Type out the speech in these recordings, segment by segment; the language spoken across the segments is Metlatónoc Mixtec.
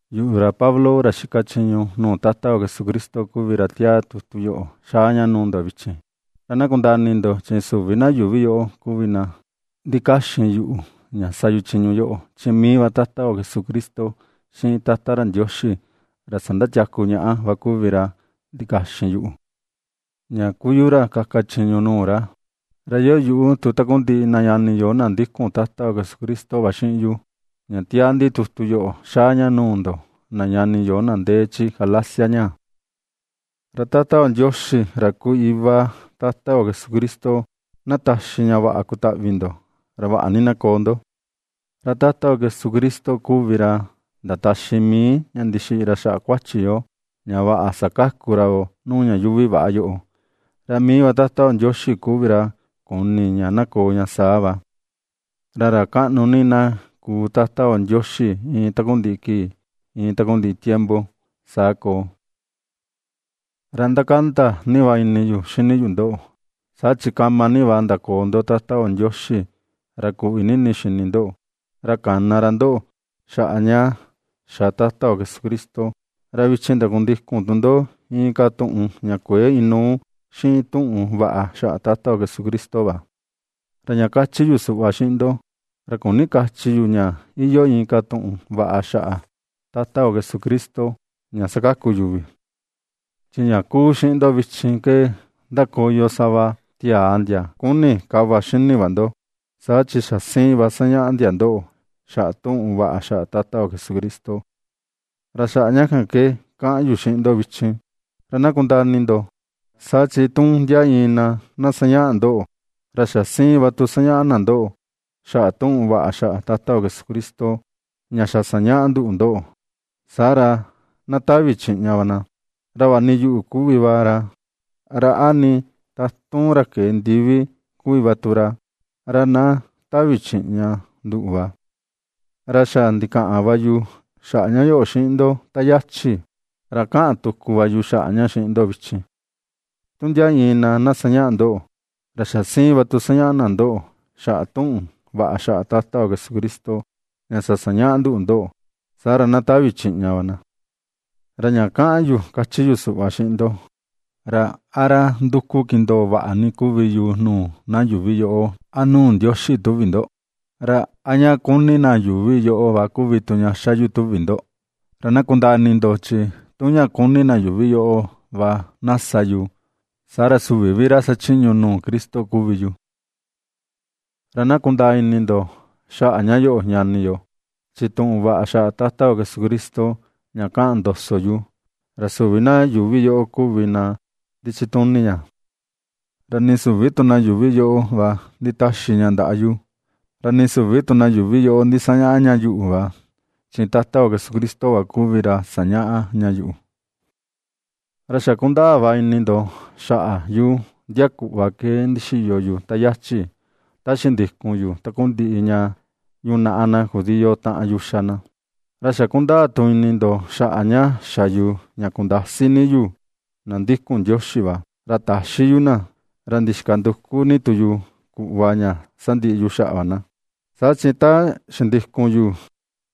Yuꞌu, ra Pablo ra xika chiñu nuu Tata yo Jesucristo kuvi ra ^tiaa tutu yoꞌo xaa ña nuu ndo vichin. Ra na kundaa ini ndo, chi süvi na yuuvi yoꞌo kuvi na ndikaxin yuꞌu ña sa yu chiñu yoꞌo, chi mii va Tata yo Jesucristo xiꞌin Tata ra Ndioxi, ra sandatiaku ñaꞌa va kuvi ra ndikaxin yuꞌu, ña kuu yu ra kaka chiñu nuu ra. Ra iyoo yuꞌu tu takundiꞌi na ñani yo na ndikun Tata yo Jesucristo va xiꞌin yu, ña ^tiaa ndi tutu yoꞌo xaa ña nuu ndoꞌo na ñani yo na ndee chi Galacia ñaa. Ra Tata yo Ndioxi, ra kuu iva Tata yo Jesucristo, na taxi ña vaꞌa kutaꞌvi ndo, ra vaꞌa ni na koo ndo. Ra Tata yo Jesucristo kuvi ra ndataxi mii, ña ndixiꞌi ra xaꞌa kuachi yo, ña vaꞌa sakaku ra yoo nuu ña yuuvi väꞌa yoꞌo, ra mii va Tata yo Ndioxi kuvi ra kuni ña na koo ña saa va. Ra ra kaꞌnu ni na kuu Tata yo Ndioxi iin takundiꞌi kii, iin takundiꞌi tiempo. Saa koo. Ra ndakanda ni va ini yu xini yu ndoꞌo, saa chi kama ni va ndakoo ndo Tata yo Ndioxi, ra kuꞌvi ni ini xini ndoꞌo, ra kana ra ndoꞌo xaꞌa ña xa Tata yo Jesucristo, ra vichin ndakundikun tu ndo inka tuꞌun ña kuëe inuu xiꞌin tuꞌun vaꞌa xaꞌa Tata yo Jesucristo va. Ra ña kachi yu suꞌva xiꞌin ndo, ra küni kachi yu ña iyoo inka tuꞌun vaꞌa xaꞌa Tata yo Jesucristo ña sakaku yuvi. Chi ña ^kuu xiꞌin ndo vichin ke, ndakoyo sava tiaa ndia ^kuni ^kava xini va ndo, saa chi xa siin va sañaꞌa ndia ndoꞌo xaꞌa tuꞌun vaꞌa xaꞌa Tata yo Jesucristo. Ra xaꞌa ña kan ke kaꞌan yu xiꞌin ndo vichin, ra na kundaa ini ndo, saa chi tu ndia iin na, na sañaꞌa ndoꞌo, ra xa siin va tu sañaꞌa na ndoꞌo xaꞌa tuꞌun vaꞌa xaꞌa Tata yo Jesucristo, ña xa sañaꞌa nduꞌu ndoꞌo, saa ra, na tavi chiꞌña va na. Ra vaꞌa nii yuꞌu kuvi va ra, ra a nii tatun ra kee ndivi kuvi va tu ra, ra na tavi chiꞌña nduꞌu va. Ra xa ndikaꞌan va yu xaꞌa ña yoꞌo xiꞌin ndo ta yachi, ra kaꞌan tuku va yu xaꞌa ña xiꞌin ndo vichin: Tu ndia iin na, na sañaꞌa ndoꞌo, ra xa siin va tu na sañaꞌa na ndoꞌo, xaꞌa tuꞌun vaꞌa xaꞌa Tata yo Jesucristo, ña xa sañaꞌa nduꞌu ndoꞌo, saa ra na tavi chiꞌña va na. Ra ña kaꞌan yu kachi yu suꞌva xiꞌin ndo, ¿ra a ra nduku kindoo vaꞌa ni kuvi yu nuu na yuuvi yoꞌo a nuu Ndioxi, tuvi ndo? ¿Ra a ña kuni na yuuvi yoꞌo va kuvi tu ña xa yu, tuvi ndo? Ra na kundaa ini ndo, chi tu ña kuni na yuuvi yoꞌo va na sa yu, saa ra süvi vi ra xachiñu nuu Cristo kuvi yu. Ra na kundaa ini ndo xaꞌa ña yoꞌo ñani yo, chi tuꞌun vaꞌa xaꞌa Tata yo Jesucristo ña kaꞌan ndoso yu, ra süvi na yuuvi yoꞌo kuvi na ndichituni ña. Ra nii süvi tu na yuuvi yoꞌo va nditaxi ña ndaꞌa yu, ra nii süvi tu na yuuvi ndisañaꞌa ña yuꞌu va, chi Tata yo Jesucristo va kuvi ra sañaꞌa ña yuꞌu. Ra xa kundaa va ini ndo xaꞌa yu ndia kuꞌva ke ndixiyo yu ta yachi, ta xindikun yu takundiꞌi ña yunaꞌa na judío taꞌan yu ^xa na. Ra xa kundaa tu ini ndo xaꞌa ña xa yu ña kundasi ni yu na ndikun Ndioxi va, ra taxi yu na, ra ndixika nduku ni tu yu kuꞌva ña sandiꞌi yu xaꞌa va na. Saa chi ta xindikun yu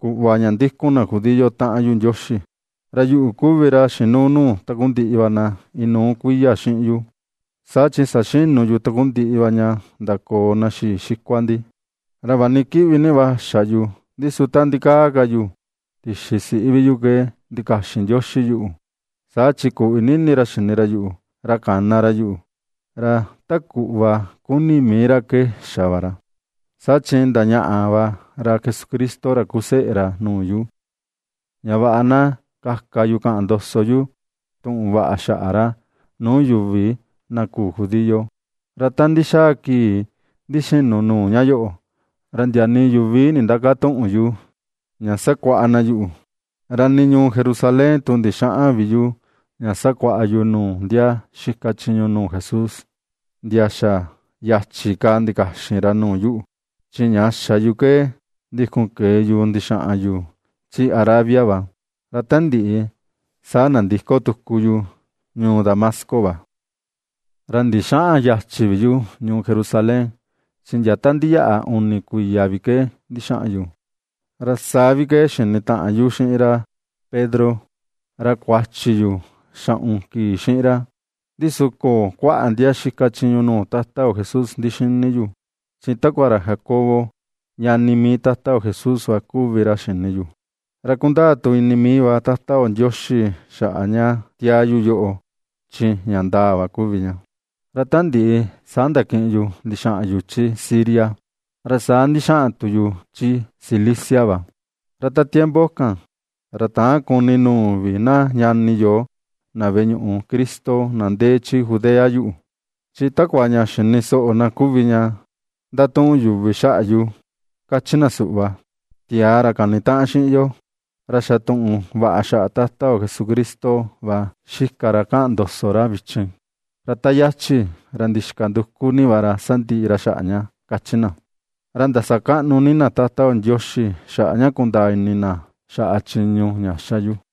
kuꞌva ña ndikun na judío taꞌan yu Ndioxi, ra yuꞌu kuvi ra xinuu nuu takundiꞌi va na inuu kuiya xiꞌin yu, saa chi saxinu yu takundiꞌi va ña ndakoo na xii xikua ndi. Ra vaꞌa ni kiꞌvi ni va xa yu, ndi su ta ndikaa ka yu tixi siꞌi vi yu ke ndikaxin Ndioxi yuꞌu, saa chi kuꞌvi ni ini ra xini ra yuꞌu, ra kana ra yuꞌu. Ra ta kuꞌva kuni mii ra ke xa va ra, saa chi ndañaꞌa va ra Jesucristo ra kuu seꞌe ra nuu yu, ña vaꞌa na kaka yu kaꞌan ndoso yu tuꞌun vaꞌa xaꞌa ra, nuu yuvi na küu judío. Ra ta ndixaa kii ndixinu nuu ña yoꞌo, ra ndia nii yuvi nindäkatuꞌun yu ña sakuaꞌa na yuꞌu, ra nii ñuu Jerusalén tu ndixäꞌan vi yu ña sakuaꞌa yu nuu ndia xika chiñu nuu Jesús, ndia xa yachi ka ndikaxin ra nuu yuꞌu, chi ña xa yu ke ndikun kee yu ndixaꞌan yu chi Arabia va, ra ta ndiꞌi, saa nandiko tuku yu ñuu Dasmasco va. Ra ndixäꞌan yachi vi yu ñuu Jerusalén, chi ndia ta ndiyaꞌa uni kuiya vi ke ndixaꞌan yu; ra saa vi ke xinitaꞌan yu xiꞌin ra Pedro, ra kuachi yu xaꞌun kii xiꞌin ra. Ndi su köo kuaꞌa ndia xika chiñu nuu Tata yo Jesús ndixini yu, chi takua ra Jacobo ñani mii Tata yo Jesús va kuvi ra xini yu. Ra ^kundaa tu ini mii va Tata yo Ndioxi xaꞌa ña tiaa yu yoꞌo, chi ña ndaa va kuvi ña. Ra ta ndiꞌi, saa ndakiꞌin yu ndixaꞌan yu chi Siria, ra saa ndixaꞌan tu yu chi Cilicia va. Ra ta tiempo kan, ra täan kuni nuu vi na ñani yo, na veꞌe ñuꞌu Cristo, na ndee chi Judea yuꞌu, chi takua ña xini soꞌo na kuvi ña ndatuꞌun yuvi xaꞌa va yu, kachi na suꞌva: “Tiaa, ra kanitaꞌan xiꞌin yo, ra xa tuꞌun vaꞌa xaꞌa Tata yo Jesucristo va xika ra kaꞌan ndoso ra vichin, ra ta yachi, ra ndixika nduku ni ra ña sandiꞌi ra xaꞌa ña”, kachi na. Ra ndasakaꞌnu ni na Tata yo Ndioxi, xaꞌa ña kundaa ini na xaꞌa chiñu ña ^xa yu.